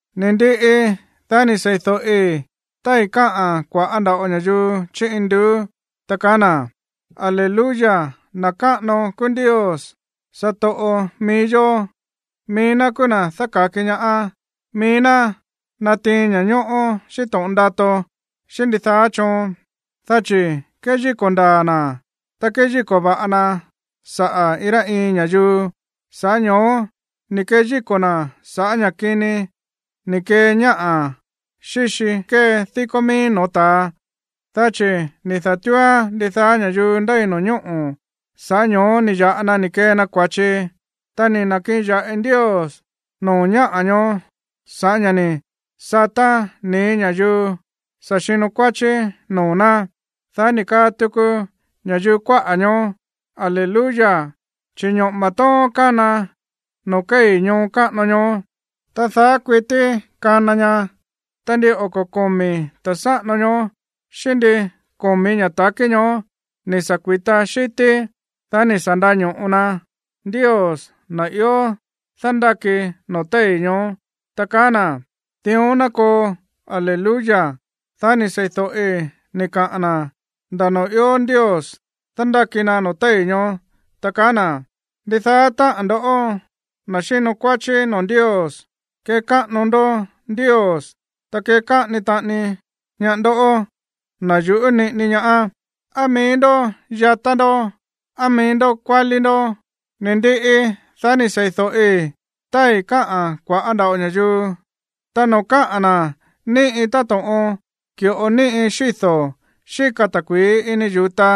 Ni̱ ndiꞌi, dá ni̱ sei̱do̱ꞌi tái̱ káꞌa̱n kua̱ꞌá nda̱ꞌo ña̱yuu chí induú, ta kaá na̱: ¡Aleluya, na̱ káꞌano kúú Ndios, satoꞌo mií yó! Mií ná kúú na̱ dáka̱ki ñaá, mií ná natiin ña̱ñóꞌó xíꞌín to̱ꞌon ndato xíꞌín ndidaá choon, dá chi̱ kéyíko̱ ndaa̱ na̱, ta kéyíko̱ va̱ꞌa na saꞌa̱ iin rá iin ña̱yuu, sa̱ꞌá ño̱ó ni̱ keyíko̱ na̱ sa̱ꞌá ña̱ kini ni̱ kee ñáꞌa̱ xíxi kée díkó mií no̱ó ta̱a, dá chi̱ ni̱ da̱túúán ndidaá ña̱yuu ndéi no̱ñóꞌo̱, sa̱ꞌá ño̱ó ni̱ ya̱ꞌa na ni̱ kee na kua̱chi. Ta ni̱ na̱kiꞌin ya̱ꞌi Ndios noo̱ ñáꞌa̱ ñoó sa̱ꞌá ña̱ ni̱ sataa̱n nii̱ ña̱yuu sa̱ xino kuáchí noo̱ ná. Dá ni̱ kaa tuku ña̱yuu kuáꞌa̱ ñoó: ―¡Aleluya! Chi̱ ñoꞌo̱ma̱ tóón kána noo̱ kéi̱ ñoo káꞌano ñoó. Ta daá kuití kana ña. Ta ndin oko̱ komi̱ ta̱ sáꞌano ñoó xíꞌín ndin komi̱ ña̱ ta̱kí ñoó ni̱ sa̱ kui̱ta xi̱tí, dá ni̱ sa̱ nda̱ño̱ꞌo na Ndios, na̱ ió dándáki noo̱ téi̱ ñoó, ta kaá na̱: ―¡Dión ná koo! ¡Aleluya! Dá ni̱ sei̱do̱ꞌi ni̱ kaꞌa̱n na̱ nda̱ noo̱ ió Ndios dándáki na noo̱ téi̱ ñoó, ta kaá na̱: Ndidaá táꞌa̱n ndo̱ꞌó, na̱ xínkuáchí noo̱ Ndios, kekáꞌano ndó Ndios. Ta kekáꞌano taꞌani ñaá ndo̱ꞌó, na̱ yuꞌú niꞌini ñaá, á mií ndó yatá ndó, o á mií ndó kuálí ndó. Ni̱ ndiꞌi, dá ni̱ sei̱do̱ꞌi tái̱ káꞌa̱n kua̱ꞌá nda̱ꞌo ña̱yuu, ta noo̱ káꞌa̱n na̱ níꞌi táto̱ꞌon ki̱ꞌo níꞌi xído̱ xíka ta̱kui̱í ini yu̱ta,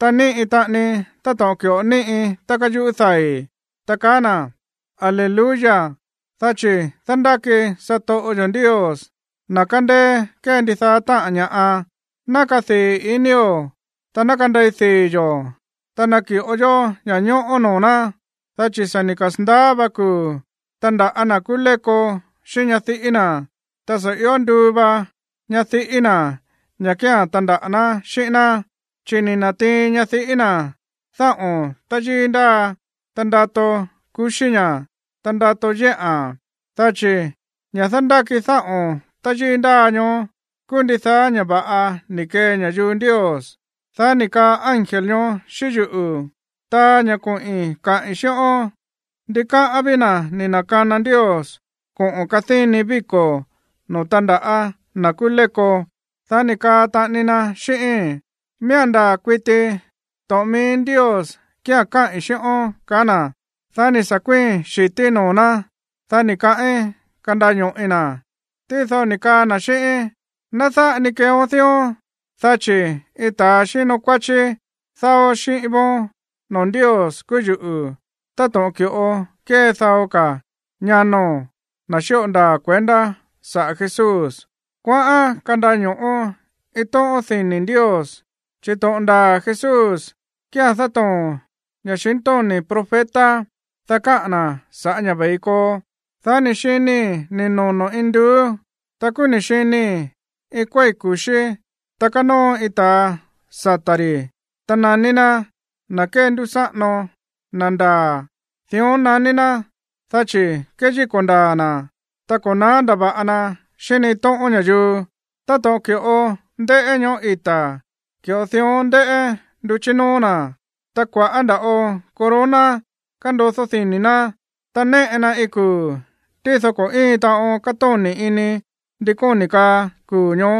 ta níꞌi taꞌani táto̱ꞌon ki̱ꞌo níꞌi tá káyuꞌú dai̱, ta kaá na̱: Aleluya, dá chi̱ dándáki satoꞌo yo̱ Ndios, na̱ kándéé kée ndidaá táꞌa̱n ña̱ꞌa. Ná kadii̱ inío̱, ta ná kandei dii̱ yo̱, ta naki̱ꞌo yó ña̱ñóꞌó noo̱ ná, dá chi̱ sa̱ ni̱ kasa̱ndaá va kuu̱ tandaꞌa̱ na̱ kúú léko xíꞌín ñadiꞌí na̱, ta sa̱ io nduu va ñadiꞌí na̱ ña̱ kía̱n tandaꞌa̱ ná xíꞌín ná. Chi̱ ni̱ na̱tiin ñadiꞌí na̱ dáꞌo̱n táyíí ndáa, ta ndato kuxí ña̱, ta ndato yéꞌa̱n. Dá chi̱ ña̱ dándáki dáꞌo̱n táyíí ndáa ñoó kúú ndidaá ña̱ va̱ꞌa ni̱ kee ña̱yuu Ndios. Dá ni̱ kaꞌa̱n ángel ñoó xíꞌín yuꞌu̱: ―Taa ña̱ koꞌi̱n kaꞌi̱n xíꞌón: “Ndikáꞌán ví na̱ ni̱ na̱kana Ndios koꞌo̱n kadíni víko̱ noo̱ tandaꞌa̱ na̱ kúú léko.” Dá ni̱ kaa taꞌani na xíꞌíín: ―Miía̱n ndaa̱ kuiti to̱ꞌon mií Ndios kía̱n káꞌi̱n xíꞌón ―kaá na̱. Dá ni̱ sa̱ kuíi̱n xi̱tíí noo̱ ná, dá ni̱ kaꞌín kandaño̱ꞌi na̱. Tído ni̱ kaa na̱ xíꞌíín: ―Ná dáꞌa ni keeón dión, dá chi̱ iin ta̱ xíno kuáchí dáó xíꞌín vóón noo̱ Ndios kúú yuꞌu̱, táto̱ꞌon ki̱ꞌo kée dao ka̱ ñano̱n, na̱ xíꞌo ndaa̱ kuendá saꞌa̱ Jesús. Kuaꞌán kandaño̱ꞌo iin tóꞌón dini̱ Ndios. Chi̱ to̱ꞌon ndaa̱ Jesús kía̱n dátoo̱n ña̱xintóni̱ profeta, dá káꞌa̱n na̱ sa̱ꞌá ña̱ ve̱i koo. Dá ni̱ xinii̱ ni̱ nono̱ induú, ta kúú ni̱ xinii̱ iin kuéi̱ ku̱xí, ta kánóo iin ta̱a sata̱ ri̱, ta naní ná, Na̱ Kéndúsáꞌano, Na̱ Ndaa̱. Dión naní ná, dá chi̱ kéyíko̱ ndaa̱ na̱, ta ko̱ na̱á ndava̱ꞌa na xíꞌín ni iin tóꞌón ña̱yuu. Táto̱ꞌon ki̱ꞌo ndéꞌé ñoꞌó ita̱, ki̱ꞌo dión ndéꞌé nduchí nóó na̱. Ta kua̱ꞌá nda̱ꞌo corona kándodó dini̱ ná. Ta néꞌe na iin kuu̱, tído ko̱ íin taꞌon kátóni̱ ini ndi kóni̱ kaa kuu̱ ñoó,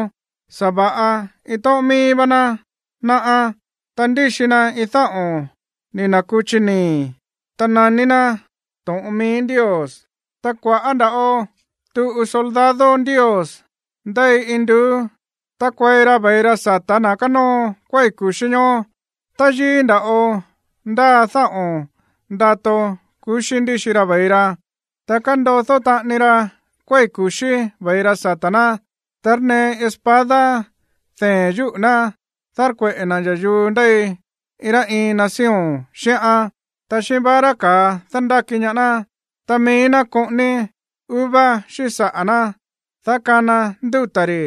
sa̱va̱ꞌa iin tóꞌón mií vá ná náꞌá. Ta ndíxi na iin dáꞌo̱n ni̱ na̱kuchi nii̱. Ta naní ná, To̱ꞌon Mií Ndios. Ta kua̱ꞌá nda̱ꞌo tuꞌu soldado Ndios ndéi induú tákuei ra ve̱i ra sa̱tá na̱ kánóo kuéi̱ ku̱xí ñoó. Táyíí nda̱ꞌo ndáa dáꞌo̱n ndato kuxí ndíxi ra ve̱i ra, ta kándodó taꞌani ra kuéi̱ ku̱xí ve̱i ra sata̱ ná. Tárnee iin espada dee̱n yúꞌu̱ ná dárkueꞌe̱ na̱ ña̱yuu ndéi iin rá iin nación xíꞌán. Ta xíꞌín vara ka̱a dándáki ñaá ná. Ta mií ná koꞌóní uva xíꞌín saꞌa̱ ná, dá kana ndúta̱ ri̱.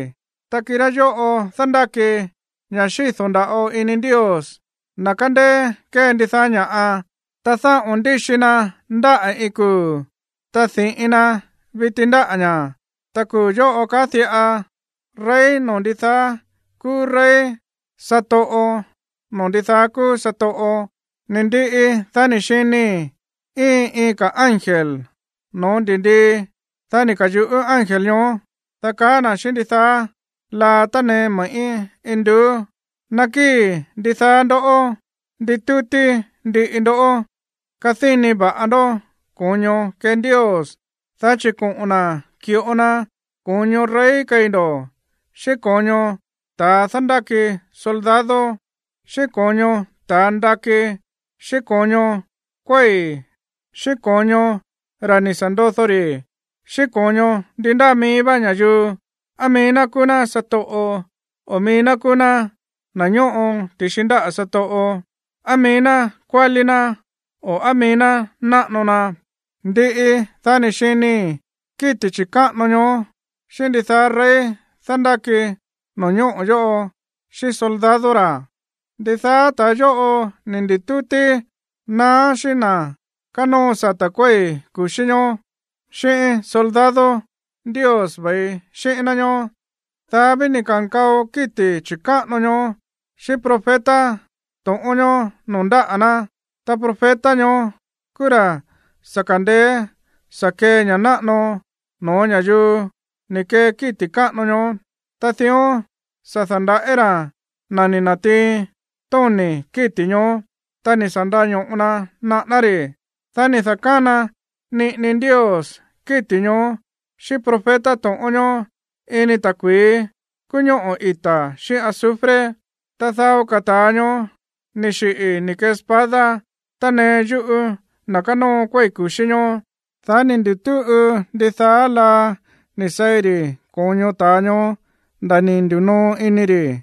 Ta kirá yóꞌo̱ dándáki ña̱ xído̱ nda̱ꞌo ini Ndios, na̱ kándéé kée ndidaá ña̱ꞌa. Ta dáꞌo̱n ndíxi na ndáꞌa̱ iin kuu̱, ta di̱ꞌin na viti ndáꞌa̱ ña̱. Ta kuu̱ yóꞌo kaá diꞌa: “Rey noo̱ ndidaá kúú rey, Satoꞌo noo̱ ndidaá kúú satoꞌo.” Ni̱ ndiꞌi, dá ni̱ xinii̱ íin iin ka̱ ángel no̱ó ndi̱ndii, dá ni̱ ka̱yuꞌú ángel ñoó, dá kaá na̱ xíꞌín ndidaá laa tánee me̱ꞌí induú: ―Nakíi̱ ndidaá ndoꞌó nditútí ndiꞌi ndó kadíni va̱ꞌa ndó ko̱ño kee Ndios, dá chi̱ koꞌo̱n na̱ ki̱ꞌo na ko̱ño rey keí ndo̱, xíꞌín ko̱ño ta̱ dándáki soldado, xíꞌín ko̱ño ta̱ ndakí xíꞌín ko̱ño kuéi̱ xíꞌín ko̱ño ra̱ ni̱ sa̱ ndodó rí, xíꞌín ko̱ño ndi ndáa mií vá ña̱yuu, á mií ná kúú ná satoꞌo o mií ná kúú ná na̱ ñóꞌo ti̱xi ndáꞌa̱ satoꞌo, á mií ná kuálí ná o á mií ná náꞌano na. Ndiꞌi, dá ni̱ xinii̱ kíti̱ chi̱káꞌano ñoó xíꞌín ndidaá rey dándáki no̱ñóꞌo̱ yóꞌo xíꞌín soldado ra̱. Ndidaá ta̱a yóꞌo ni̱ ndi̱tútí na̱á xíꞌín na̱ kánóo sata̱ kuéi̱ ku̱xí ñoó, xíꞌín soldado Ndios ve̱i xíꞌín ná ñoó. Dá ví ni̱ ka̱nkao kíti̱ chi̱káꞌano ñoó xíꞌín profeta to̱ꞌón ñoó noo̱ ndáꞌa̱ ná. Ta profeta ñoó kúú ra̱ sa̱ kandeé sa̱ kee ña̱ náꞌano no̱ó ña̱yuu ni̱ kee kíti̱ káꞌano ñoó, ta dión sa̱ da̱ndaꞌí ra̱ na̱ ni̱ na̱tiin tóni̱ kíti̱ ñoó, ta ni̱ sa̱ nda̱ño̱ꞌo na naꞌáná ri̱. Dá ni̱ da̱kána niꞌini Ndios kíti̱ ñoó xíꞌín profeta to̱ꞌón ñoó ini ta̱kui̱í kúú ñoꞌó ita̱ xíꞌín azufre. Ta dao ka̱ ta̱a ñoó ni̱ xiꞌi̱ ni̱ kee espada tánee yúꞌu̱ na̱ kánóo kuéi̱ ku̱xí ñoó. Dá ni̱ ndutúꞌu ndidaá laa ni̱ seí ri̱ ko̱ño ta̱a ñoó nda̱ ni̱ ndi̱noo ini ri̱.